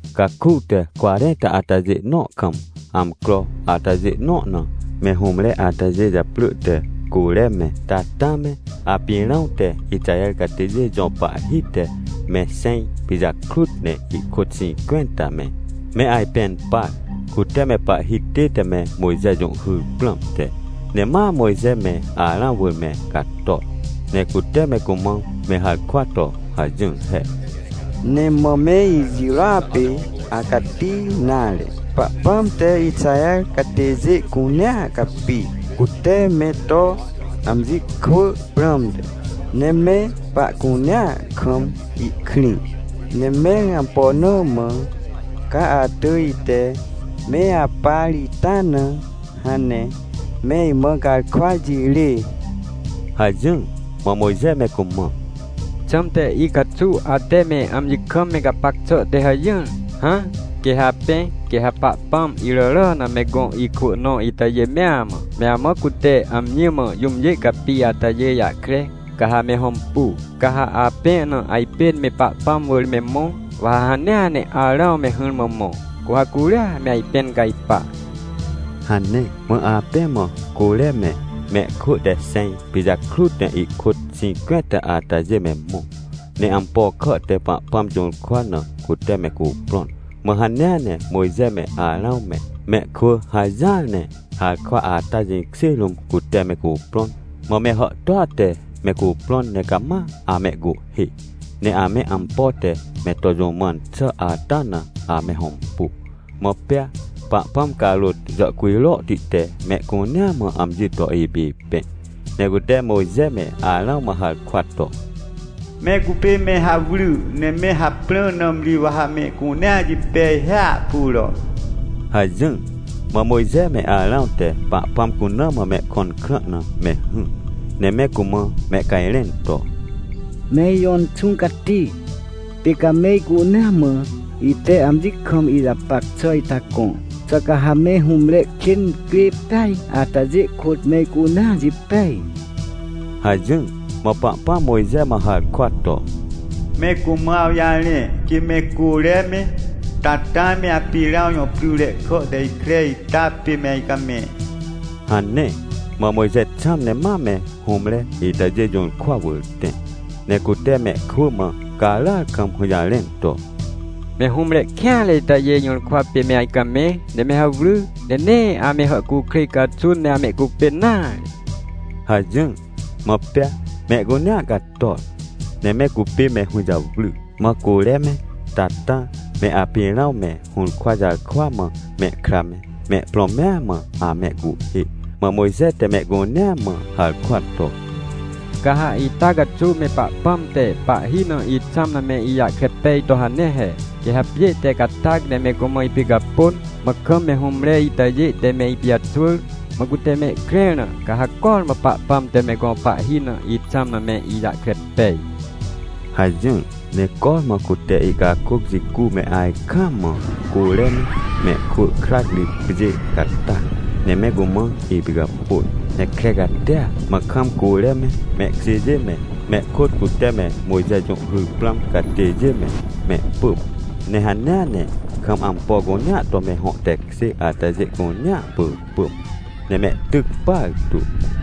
Caku te cwarẽnta atajê nõ kam, amcro atajê nõ na me hũmre atajê japrỳ te Côre me, Tatã me Apirãw te Ixaher catêjê jõ pahhi te me xẽj pijakrut ne ihkôt xĩncwẽnta me, me ajpẽn par, cute me pahhi tête me Mojxe jũhhyr prãmte. Ne ma Mojxe me Arãw wỳr me cator, ne cute me cumã me harkwa to hajỹr he: — Nee mã me ijirôa pê acati nare. Pahpãm te Ixaher catêjê cunea capi, cute me to amji kwỳ prãmte, ne me pahcunea kam ihkrĩ. Ne mẽr ampo na mã ca atỳj ite me apar ita na, hãn ne me imã garkwa jirê? — hajỹr. Mã Mojxe me cumã: — Xãmte icaxuw ate me amji kam me gapac xà te hajỹr? Hã, quê ha apẽ, quê ha Pahpãm iràrà na me gõ ikwỳ nõ itajê mea mã, me amã cute amji mã jũmjê capi atajê jahkre, ca ha me hõmpu. Ca ha apẽ na ajpên me Pahpãm wỳr me mõ, wa ha hanea ne Arãw me hỹrmã mõ, cu ha curia me ajpẽn cajpa — hane. Mã apẽ mã Côre me, mehkwỳ te xẽj pijakrut ne ihkôt xĩncwẽnta atajê me mõ, ne ampo kà te Pahpãm jũrkwa na cute me cuprõn. Mã hanea ne Mojxe me Arãw me, mehkwỳ hajỹar ne harkwa ata jĩkjê rũm cute me cuprõn. Mã me hàhtôa te me cuprõn ne cama amehcuhhê, ne ame ampo te me to jũ mãn xà ata na ame hõmpu. Mã pea Pahpãm carôt jàhcujrohti te mehcunea mã amji to ipipẽ, ne cute Mojxe me Arãw mã harkwa to: — Me cupê me hawry, ne me haprã, nãmri wa ha mehcunea jipej hiahpuro! — hajỹr. Mã Mojxe me Arãw te Pahpãm cuna mã mehkõn krã na me hỹr, ne me cumã mehcajrẽn to: — Me ijõ Inxũ Cati, pê ca me icunea mã ite amji kam ijapac xà ita gõ. Xà ca ha me hũmre kên incrê peaj atajê kôt mehcunea jipej? — hajỹr. Mã Pahpãm Mojxe mã harkwa to: — Me cumã awjarẽ, quê me Côre me, Tatã me Apirãw jõ pryre kà te ikre ita pê me ajcamẽ — hane. Mã Mojxe xãm ne ma me hũmre itajê jũrkwa wỳr tẽ, ne cute mehkwỳ mã caràar kam hũjarẽn to: — Me hũmre kêanre itajê jũrkwa pê me ajcamẽ, ne me hawry! Ne nee ame hàhcukrêj caxun ne amehcupên nare! — hajỹr. Mã pea mehcunea cator, ne me cupê me hũjawry. Mã Côre me Tatã me Apirãw me hũrkwa jarkwa mã mehkra me, mehprõ mea mã amehcuhhê. Mã Mojxe te mehcunea mã harkwa to: — Ca ha ita caxuw me Pahpãm te pahhi na ixãm na me ijahkre pej to hane he. Quê ha pjê te catac ne me cumã ipicapôn, mã kam me hũmre itajê te me ipijaxwỳr, mã cute mehkrẽr na, ca ha cormã Pahpãm te me gõ pahhi na ixãm na me ijahkre pej — hajỹr. Ne cormã cute ihcakôc jicu me ajkaam mã Côre me, mehkwỳ krac ri pjê catac ne me cumã ipicapôn, ne kre catia. Mã kam Côre me, mehkjêjê me, me kôt cute me Mojxe jũhhyr prãm catêjê me, mehpỳm. Ne hanea ne kam ampo cunea to me hõ tekjê atajê cunea pỳpỳm, ne mehtyc partu.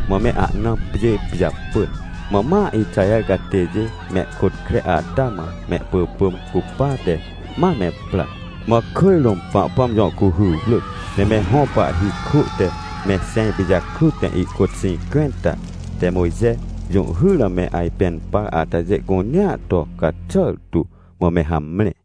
Mã me ahna pjê pijapỳn. Mã ma Ixaher catêjê mehkôt kre ata mã mehpỳpỳm cupate, ma me pra. Mã kỳj rũm Pahpãm jõ cuhy wrỳc, ne me hõ pahhi kwỳ te me xẽj pijakrut ne ihkôt xĩncwẽnta te Mojxe jũhhyr na me ajpẽn par atajê cunea to caxàr tu, mã me hamre.